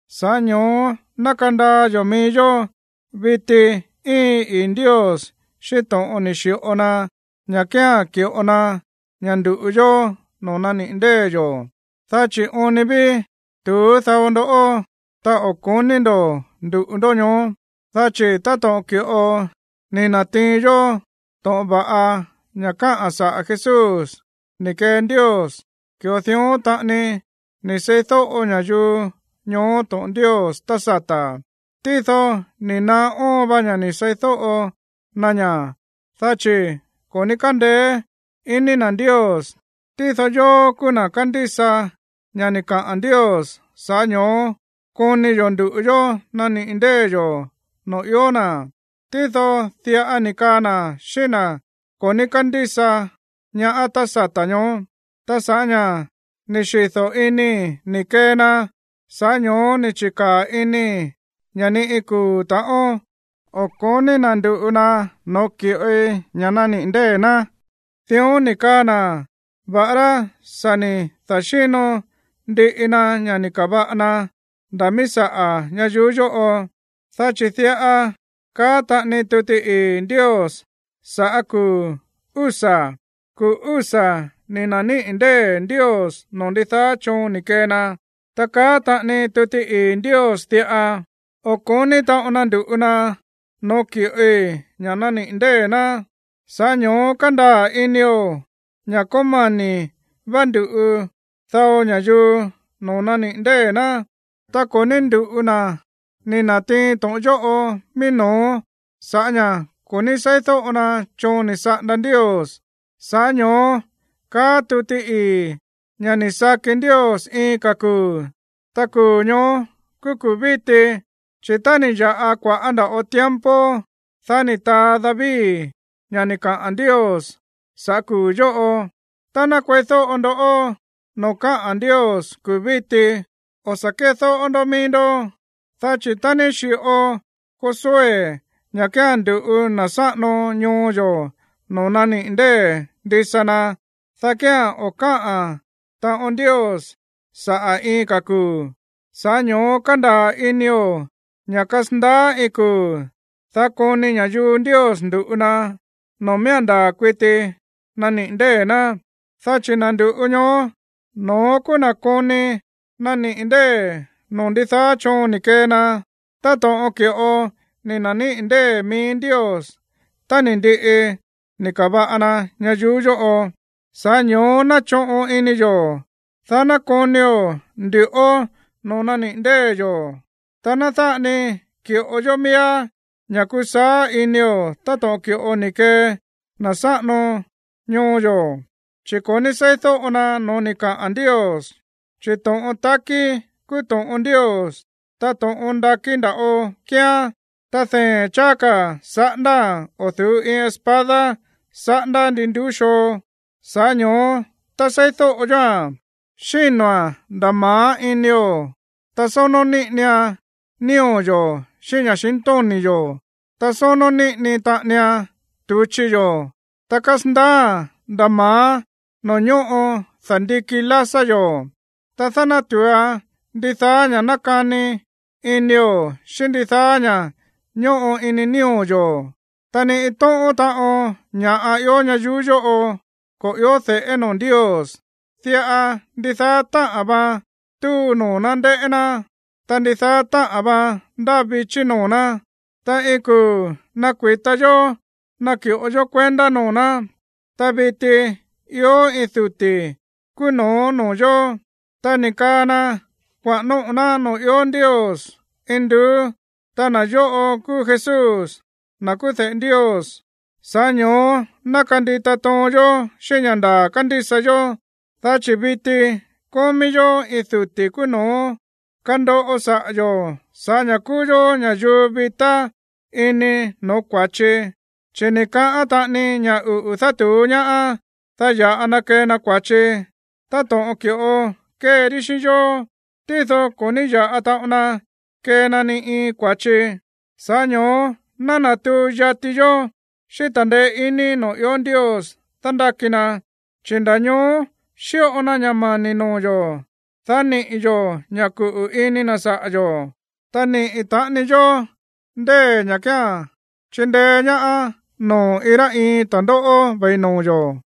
Sa̱ꞌá ño̱ó ná kandaa yo̱ mií yó, viti íin ii̱ Ndios xíꞌín to̱ꞌon ni̱ xi̱ꞌo na ña̱ kía̱n ki̱ꞌo na ña̱ ndu̱ꞌu yó noo̱ naniꞌi̱ ndée̱ yo̱, dá chi̱ oon ni ví tu̱ú dao ndoꞌó, ta o̱ ko̱ní ndo̱ ndu̱ꞌu ndó ñoó. Dá chi̱ táto̱ꞌon ki̱ꞌo ni̱ na̱tiin yó to̱ꞌon va̱ꞌa ña̱ káꞌa̱n saꞌa̱ Jesús ni̱ kee Ndios, ki̱ꞌo dión taꞌani ni̱ seídóꞌo ña̱yuu ñoó to̱ꞌon Ndios tá sata̱. Tído ni̱ naá óon va ña̱ ni̱ seídóꞌo na ña̱, dá chi̱ ko̱ ní kándeé iní na̱ Ndios. Tído yóó kúú na̱ kándísa ña̱ ni̱ kaꞌa̱n Ndios, sa̱ꞌá ño̱ó koni yo̱ ndu̱ꞌu yó naniꞌi̱ ndée̱ yo̱ noo̱ ió na̱. Tído diꞌa ni̱ kaa na̱ xíꞌín na̱ ko̱ ní kándísa ñaá tá sata̱ ñoó: Ta sa̱ꞌá ña̱ ni̱ xido̱ inii̱ ni̱ kee na, sa̱ꞌá ño̱ó ni̱ chi̱kaa̱ inii̱ ña̱ ni iin kuu̱ ta̱ꞌón o̱ ko̱ní na̱ ndu̱ꞌu na noo̱ ki̱ꞌoi ña̱ naniꞌi̱ ndée̱ ná. Dión ni̱ kaa na̱, va̱ꞌará sa̱ ni̱ da̱xíno ndiꞌi na ña̱ ni̱ ka̱va̱ꞌa na nda̱ míí saꞌa̱ ñayuú yóꞌo. Dá chi̱ diꞌa kaá taꞌani tuti ii̱ Ndios sa̱ꞌá kuu̱ úsa̱: Kuu̱ úsa̱ ni̱ na̱níꞌi̱ ndée̱ Ndios noo̱ ndidaá choon ni̱ kee na. Ta kaá taꞌani tuti ii̱ Ndios diꞌa: O̱ ko̱ní taꞌon na ndu̱ꞌu na no̱ó ki̱ꞌoi ña̱ naniꞌi̱ ndée̱ ná. Sa̱ꞌá ño̱ó kándaa̱ inio̱ ña̱ kómani̱ vá ndu̱ꞌu dao ña̱yuu noo̱ naniꞌi̱ ndée̱ ná, ta ko̱ ní ndu̱ꞌu na̱ ni̱ na̱tiin to̱ꞌon yóꞌo mií no̱ó sa̱ꞌá ña̱ ko̱ ní seídóꞌo na choon ni̱ saꞌanda Ndios. Sa̱ꞌá ño̱ó káꞌa̱n tuti ii̱ ña̱ ni̱ saki Ndios iin ka̱ kuu̱, ta kuu̱ ñóó kúú kuu̱ víti. Chi̱ tá ni̱ ya̱ꞌa kua̱ꞌá nda̱ꞌo tiempo, dá ni̱ taa David ña̱ ni̱ kaꞌa̱n Ndios saꞌa̱ kuu̱ yóꞌo: Tá ná kueídóꞌo ndó noo̱ káꞌa̱n Ndios kuu̱ víti, dá kía̱n o̱ sa̱ kédóꞌó ndó mií ndó. Dá chi̱ tá ni̱ xi̱ꞌo Josué ña̱ kía̱n ndu̱ꞌu na̱ sáꞌano ñoo yo̱ noo̱ naniꞌi̱ ndée̱ ndisa na, dá kía̱n o̱ káꞌa̱n taꞌon Ndios saꞌa̱ iin ka̱ kuu̱. Sa̱ꞌá ño̱ó kándaa̱ inio̱ ña̱ kasandaá iin kuu̱, dá koni ña̱yuu Ndios ndu̱ꞌu na noo̱ miía̱n ndaa̱ kuiti naniꞌi̱ ndée̱ ná. Dá chi̱ na̱ ndu̱ꞌu ñoó, no̱ón kúú na̱ koni naniꞌi̱ ndée̱ noo̱ ndidaá choon ni̱ kee na, táto̱ꞌon ki̱ꞌo ni̱ na̱níꞌi̱ ndée̱ mií Ndios tá ni̱ ndiꞌi ni̱ ka̱va̱ꞌa na ñayuú yóꞌo. Sa̱ꞌá ño̱ó ná choꞌon ini yo̱, dá ná konio̱ ndu̱ꞌó noo̱ naniꞌi̱ ndée̱ yo̱, ta ná dáꞌa ni ki̱ꞌo yó miíá ña̱ kusaá inio̱ táto̱ꞌon ki̱ꞌo ni̱ kee na̱ sáꞌano ñoo yo̱, chi̱ ko̱ ní seídóꞌo na no̱ó ni̱ kaꞌa̱n Ndios. Chi̱ to̱ꞌon takí kúú to̱ꞌon Ndios, ta to̱ꞌon ndakí nda̱ꞌo kíán. Ta dee̱n cháá ka̱ saꞌándáa̱n o̱ du̱ú iin espada saꞌándá ndi nduú xoo. Sa̱ꞌá ño̱ó tá seídóꞌo yóa̱n, xíno̱a̱n nda̱ ma̱á inio̱, ta sónó níꞌinian nío̱ yo̱ xíꞌín ña̱xintóni̱ yo̱. Ta sónó níꞌini taꞌanian tu̱chi yo̱, ta kásandaáa̱n nda̱ ma̱á noo̱ ñóꞌo da̱ndiki lásá yo̱. Ta nádátu̱uan ndidaá ña̱ nákani inio̱ xíꞌín ndidaá ña̱ꞌa ñóꞌo ini nío̱ yo̱. Ta ni iin tóꞌón taꞌon ña̱ꞌa ió ñayuú yóꞌo ko̱ i̱ó de̱ꞌé noo̱ Ndios. Diꞌa ndidaá táꞌa̱n vaan túu noo̱ ná ndéꞌé ná, ta ndidaá táꞌa̱n vaan ndáa vichí noo̱ ná, ta iin kuu̱ nakui̱ta yó naki̱ꞌo yó kuendá noo̱ ná. Ta viti ió iin duti̱ kúú no̱ó noo̱ yo̱, ta ni̱ kaa na kuaꞌa̱n nóꞌo̱ ná noo̱ ió Ndios induú, ta na̱ yóꞌo kúú Jesús, na̱ kúú de̱ꞌe Ndios. Sa̱ꞌá ño̱ó ná kandita toon yó xíꞌín ña̱ ndaa̱ kándísa yó. Dá chi̱ viti kómí yó iin duti̱ kúú no̱ó kandoꞌo saꞌa̱ yo̱ sa̱ꞌá ña̱ kúú yó ña̱yuu vitá ini no̱ó kua̱chi. Chi̱ ni̱ kaꞌán taꞌani ña̱ uꞌu̱ dátu̱ú ñaá, dá ya̱ꞌa na kee na kua̱chi, táto̱ꞌon ki̱ꞌo kéean xíꞌín yó, tído ko̱ ní ya̱ꞌa taꞌon na kee na ni iin kua̱chi. Sa̱ꞌá ño̱ó ná natuu yati yó xíꞌín ta̱ndeé iní noo̱ ió Ndios dándáki na, chi̱ nda̱ ñoó xíꞌo na ña̱ mani̱ noo̱ yo̱, dá niꞌi̱ yo̱ ña̱ kuꞌu̱ ini na̱ saꞌa̱ yo̱, ta niꞌi̱ taꞌani yó ndée̱ ña̱ kía̱n chindeé ñaá noo̱ iin rá iin ta̱ndóꞌó ve̱i noo̱ yo̱.